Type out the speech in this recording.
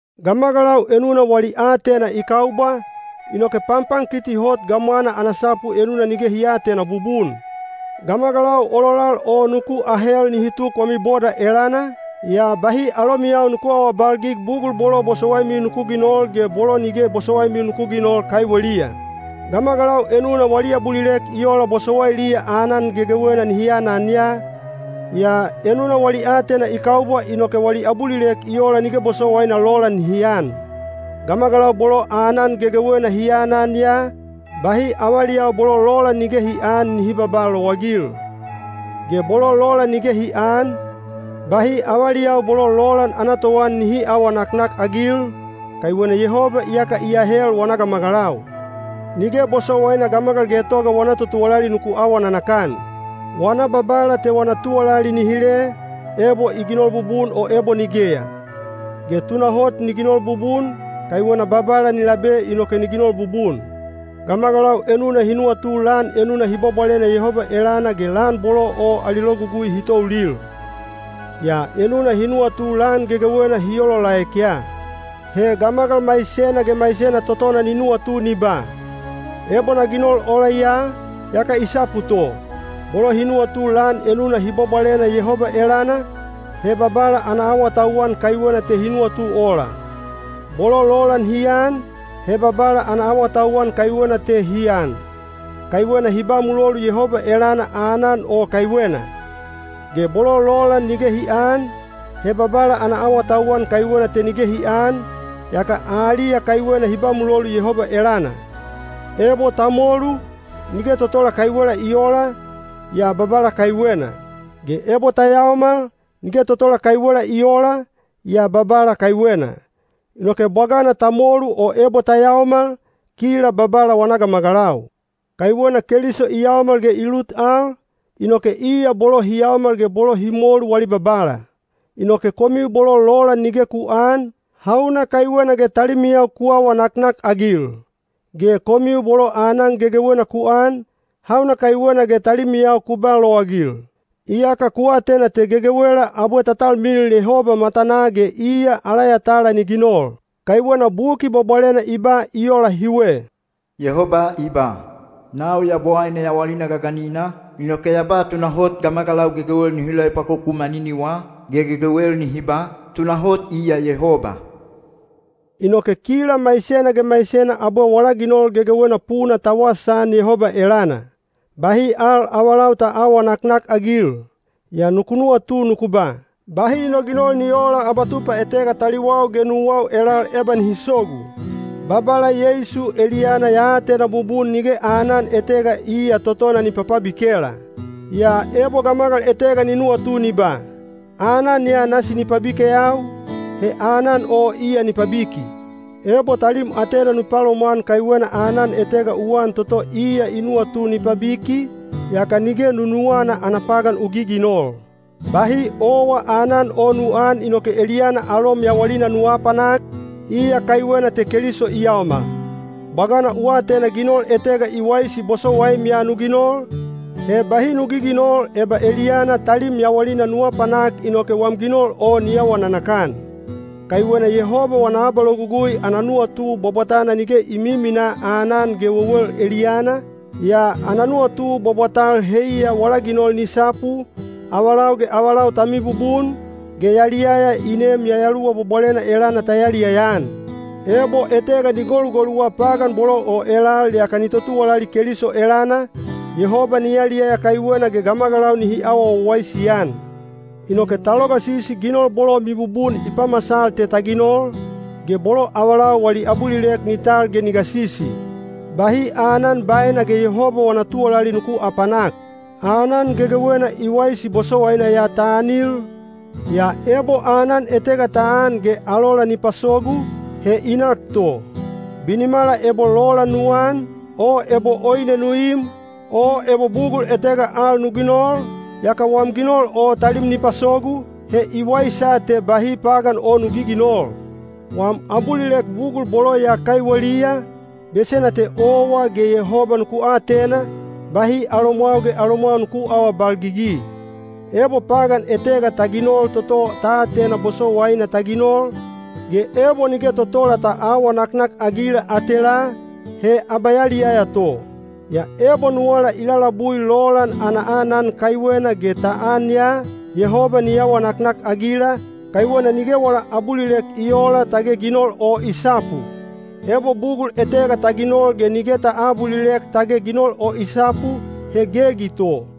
Gamagalau enuna wali aatena i kaubwa, inoke panpankiti hot gamwana ana sapu enuna nige hi aatena bubun. Gamagalau ololal o nuku ahel nihi tuk wami boda elana, yaa bahi alomiyau nuku aawabalgig bugul bolo bosowaimiu nuku ginol ge bolo nige bosowaimiu nuku ginol kaiweliya. Gamagalau enuna wali abulilek i ola bosowailiya aanan gegewena nihi anan ya, yaa enuna wali aatena i kaubwa inoke wali abulilek i ola nige bosowaina lolan nihi an. Gamagalau bolo aanan gegewena hi anan ya, bahi avaliyau bolo lolan nige hi aan nihi babaa lowagil. Ge bolo lolan nige hi aan, bahi avaliyau bolo lolan ana toan nihi aawa naknakagil, kaiwena Yehoba iyaka i ahel wana gamagalau. Nige bosowaina gamagal getoga wana totuwalali nuku awa nanakan. Wana babala te wana tuwalali ni hile, ebo i ginol bubun o ebo nigeya. Ge tunahot ni ginol bubun, kaiwena Babala ni labe inoke ni ginol bubun. Gamagalau enuna hi nuwatu lan enuna hi bwabwalena Yehoba elana ge lan bolo o ali logugui hi toulil. Yaa enuna hi nuwatu lan gegewena hi olaolaek ya. He gamagal maisena ge maisena totona ni nuwatu ni ba, “Ebo na ginol ola ya, yaka i sapu to.” Bolo hi nuwatu lan enuna hi bwabwalena Yehoba elana, he Babala ana awatauwan kaiwena te hi nuwatu ola. Bolo lolan hi an, he Babala ana awatauwan kaiwena te hi an, kaiwena hi ba mulolu Yehoba elana aanan o kaiwena. Ge bolo lolan nige hi aan, he Babala ana awatauwan kaiwena te nige hi aan, yaka aliya kaiwena hi ba mulolu Yehoba elana. Ebo ta molu, nige totola kaiwela i oola, yaa Babala kaiwena. Ge ebo ta yaomal, nige totola kaiwela i oola, yaa Babala kaiwena. Inoke bwagana ta molu o ebo ta yaomal, kila Babala wana gamagalau. Kaiwena Keliso i yaomal ge i lut al, inoke iya bolo hi yaomal ge bolo hi molu wali Babala. Inoke komiu bolo lolan nige ku aan, hauna kaiwena ge talimiyau ku awa naknakagil? Ge komiu bolo aanan gegewena ku an, hauna kaiwena ge talimiyau ku ba lowagil? Iyaka ku atena te gegewela abwe ta talmilil Yehoba matanaa ge iya ala yatala ni ginol. Kaiwena Buki Bwabwalena i ba i ola hiwe: Yehoba i ba, “Nau Yabowaine yawalina gaganina, inoke ya ba tunahot gamagalau gegewel nihi loepwakoku maniniwa, ge gegewel nihi ba, ‘Tunahot iya Yehoba.’” Inoke kila maisena ge maisena abwe wala ginol gegewena puna ta wasaan Yehoba elana. Bahi al avalau ta aawa naknakagil. Yaa nuku nuwatu nuku ba, “Bahi no ginol ni oola abatupa etega taliwau ge nuwau elal eba nihi sogu.” Babala Yeisu eliyana ya atena bubun nige aanan etega iya totona ni papabikela. Yaa ebo gamagal etega ni nuwatu ni ba, “Aanan ya nasi ni pabikeyau,” he aanan o iya ni pabiki. Ebo talim atena nu palomwan kaiwena aanan etega u an toto iya i nuwatu ni pabiki, yaka nige nunuwana ana pagan u giginol. Bahi owa aanan o nu aan inoke eliyana alom yawalina nu aapanak, iya kaiwena te Keliso i yaomal. Bwagana u atena ginol etega i waisi bosowaim ya nu ginol, he bahi nu giginol eba eliyana talim yawalina nu apanak inoke wam ginol o ni awa nanakan. Kaiwena Yehoba wana abalogugui ana nuwatu bwabwatana nige i miminaa aanan ge wewel eliyana, yaa ana nuwatu bwabwatal heiya wala ginol ni sapu, avalau ge avalau ta mibubun, ge yaliyaya i neem Yayaluwa Bwabwalena elana ta yaliyaya-an. Ebo etega ni golugoluwa pagan bolo o elal yaka ni totuwalali Keliso elana, Yehoba ni yaliyaya kaiwena ge gamagalau nihi awa wawaisi-an. Inoke ta logasisi ginol bolo mibubun i pamasal te ta ginol, ge bolo avalau wali abulilek ni tal ge ni gasisi. Bahi aanan baena ge Yehoba wana tuwalali nuku aapanak. Aanan gegewena i waisi bosowaina ya ta anil, yaa ebo aanan etega ta an ge alola ni pasogu, he i nak to. Binimala ebo lolan nu an, o ebo oine nu im, o ebo bugul etega al nu ginol, yaka wam ginol o talim ni pasogu, he i waisa te bahi pagan o nu giginol. Wam abulilek bugul bolo ya kaiweliya, besena te owa ge Yehoba nuku atena, bahi alomwau ge alomwau nuku aawabalgigi. Ebo pagan etega ta ginol toto ta atena bosowaina ta ginol, ge ebo nige totola ta aawa naknakagila atelaa, he abayaliyaya to. Yaa ebo nuwala i lalabui lolan ana aanan kaiwena ge ta an ya, Yehoba ni awa naknakagila, kaiwena nige wala abulilek i oola tage ginol o i sapu. Ebo bugul etega ta ginol ge nige ta aabulilek tage ginol o i sapu, he gegi to.